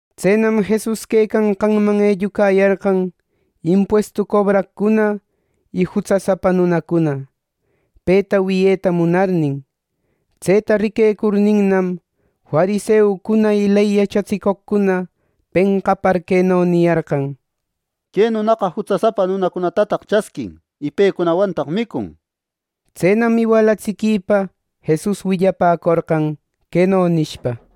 Tsenam Jesus quecanqanman ellucayarqan impuestu cobraqcuna y jutsasapa nunacuna, peta wiyeta munarnin. Tseta riquecurninnam, fariseucuna y ley yachatsicoqcuna penqapar queno niyarqan: —¡Que nunaqa jutsasapa nunacunatataq chasquin, y pecunawantaq micun! Tsenam iwalatsiquipa Jesus willapäcorqan, queno nishpa: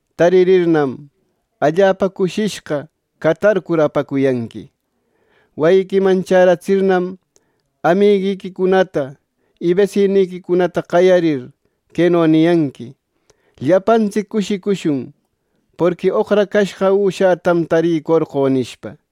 Taririrninnam, allapa cushishqa catarcur apacuyanqui. Wayiquiman chäratsirnam, amiguiquicunata y besiniquicunata qayarir, queno niyanqui: ‘Llapantsic cushicushun, porqui oqracashqa üshätam tarïcorqö’ nishpa.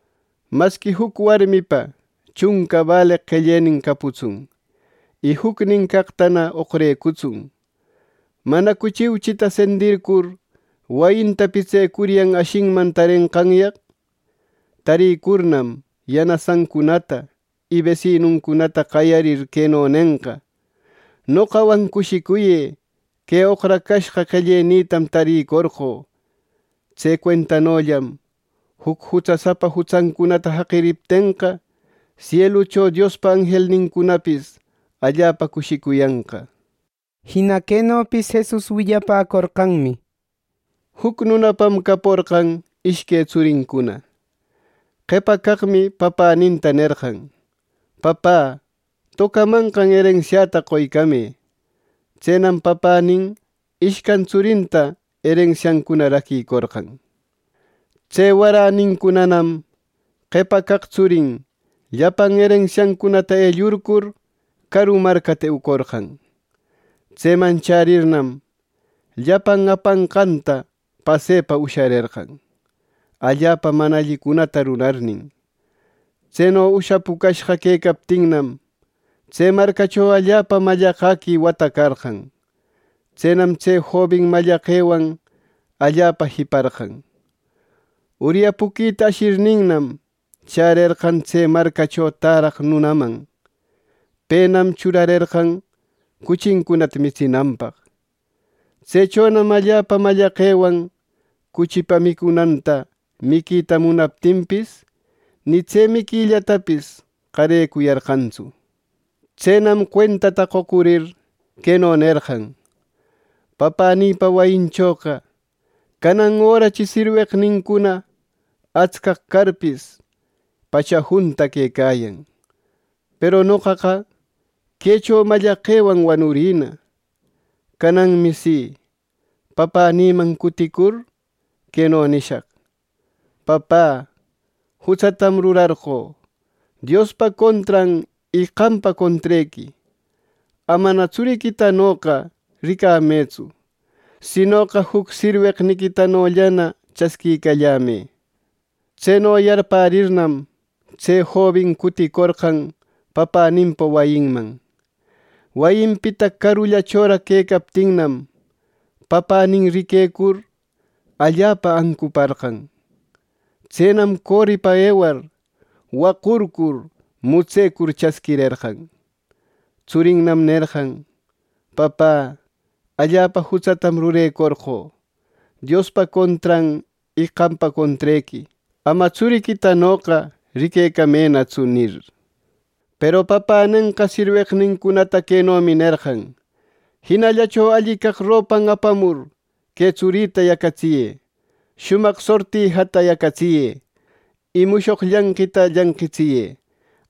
“Masqui, juc warmipa chunca baleq qellenin caputsun, y jucnin caqtana oqrecutsun. ¿Manacu chiuchita sendircur, wayinta pitsecuryan ashinman tarenqanyaq! Tarïcurnam, yanasancunata y besinuncunata qayarir, queno nenqa: ‘Noqawan cushicuyë; que oqrashqä qellenïtam tarïcorqö.’ Tse cuentanollam juc jutsasapa jutsancunata jaqiriptenqa, sielucho Diospa anjelnincunapis allapa cushicuyanqa.” Jina quenopis Jesus willapäcorqanmi, “Juc nunapam caporqan ishque tsurincuna. Qepa caqmi papäninta nerqan: ‘Papä, tocamanqan erensiäta qoycamë.’ Tsenam papänin ishcan tsurinta erensiancuna raquïcorqan. “Tse waränincunanam qepa caq tsurin llapan erensiancunata ellurcur, caru marcata eucorqan. Tseman chärirnam, llapan apanqanta pasëpa usharerqan, allapa mana allicunata rurarnin. Tseno ushapucashqa quecaptinnam, tse marcacho allapa mallaqäqui wata carqan. Tsenam tse jobin mallaqewan allapa jiparqan. Uryapuquita ashirninnam, chärerqan tse marcacho täraq nunaman. Penam churarerqan cuchincunata mitsinanpaq. Tsechonam allapa mallaqewan cuchipa micunanta miquita munaptinpis, ni tse miquillatapis qarecuyarqantsu. Tsenam cuentata qocurir, queno nerqan, ‘Papänïpa wayinchoqa canan örachi sirweqnincuna atscaq carpis, ¡pacha junta quecayan! ¡Peru noqaqa quecho mallaqewan wanurïna!’ Cananmi si, papänïman cutïcur, queno nishaq: ‘Papä, jutsatam rurarqö, Diospa contran y qampa contrequi. Amana tsuriquitanoqa ricamëtsu; sinoqa juc sirweqniquitanollana chasquicallämë.’ Tseno yarpärirnam, tse jobin cuticorqan papäninpa wayinman. “Wayinpita carullachoraq quecaptinnam, papänin riquecur allapa ancuparqan. Tsenam coripa ewar, waqurcur mutsecur chasquirerqan. Tsurinnam nerqan, ‘Papä, allapa jutsatam rurecorqö, Diospa contran y qampa contrequi. Ama tsuriquitanoqa ricamënatsu’ nir. Peru papänenqa sirweqnincunata quenomi nerqan: ‘Jinallacho alli caq ropan apamur, que tsurïta yacatsiyë; shumaq sortijata yacatsiyë; y mushoq llanqita llanqitsiyë.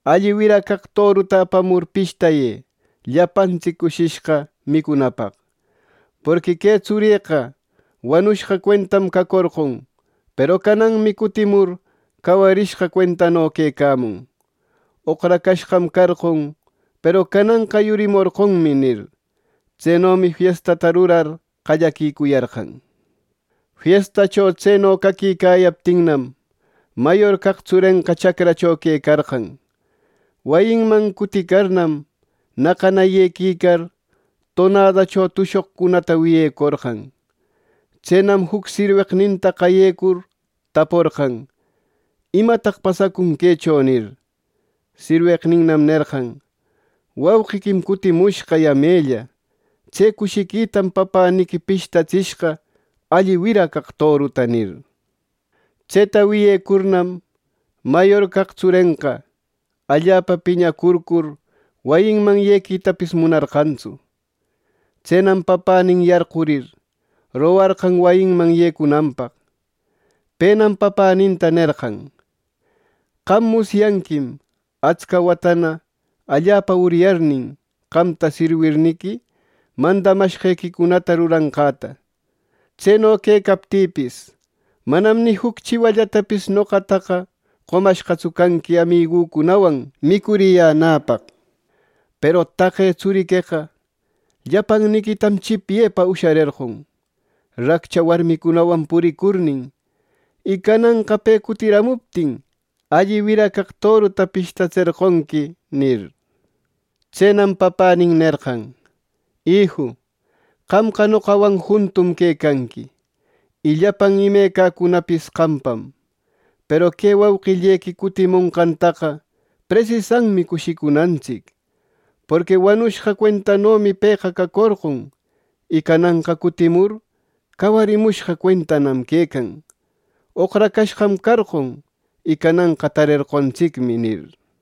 Alli wira caq toruta apamur pishtayë, llapantsic cushishqa micunapaq. Porqui que tsurïqa wanushqa cuentam cacorqon; peru cananmi cutimur cawarishqa cuentano quecamun. Oqracashqam carqon, peru cananqa yurimorqonmi’ nir. Tsenomi fiestata rurar qallaquicuyarqan. “Fiestacho tseno caquicayaptinnam, mayor caq tsurenqa chacracho quecarqan. Wayinman cuticarnam, naqana yequicar, tonadacho tushoqcunata wiyecorqan. Tsenam juc sirweqninta qayecur, taporqan, ‘¿Imataq pasacun quecho?’ nir. Sirweqninnam nerqan, ‘Wauqiquim cutimushqa yamella. Tse cushiquitam papäniqui pishtatsishqa alli wira caq toruta’ nir. Tseta wiyecurnam, mayor caq tsurenqa allapa piñacurcur, wayiman yequitapis munarqantsu. Tsenam papänin yarqurir, rogarqan wayiman yecunanpaq. Penam papäninta nerqan, ‘¡Qam musyanquim atsca watana allapa uryarnin, qamta sirwirniqui, mandamashqequicunata ruranqäta! ¡Tseno quecaptïpis, manam ni juc chiwallatapis noqataqa qomashqatsu canqui amigücunawan micuriyänäpaq! Peru taqe tsuriqueqa llapanniquitam chipyepa usharerqon, raccha warmicunawan puricurnin. Y cananqa pe cutiramuptin, ¡alli wira caq toruta pishtatserqonqui!’ nir. “Tsenam papanin nerqan, ‘Iju, qamqa noqawan juntum quecanqui, y llapan imecacunapis qampam. Peru que wauqillequi cutimonqantaqa presisanmi cushicunantsic; porqui wanushqa cuentanomi pëqa cacorqon, y cananqa cutimur cawarimushqa cuentam quecan. Oqracashqam carqon, y cananqa tarerqontsicmi’ nir.”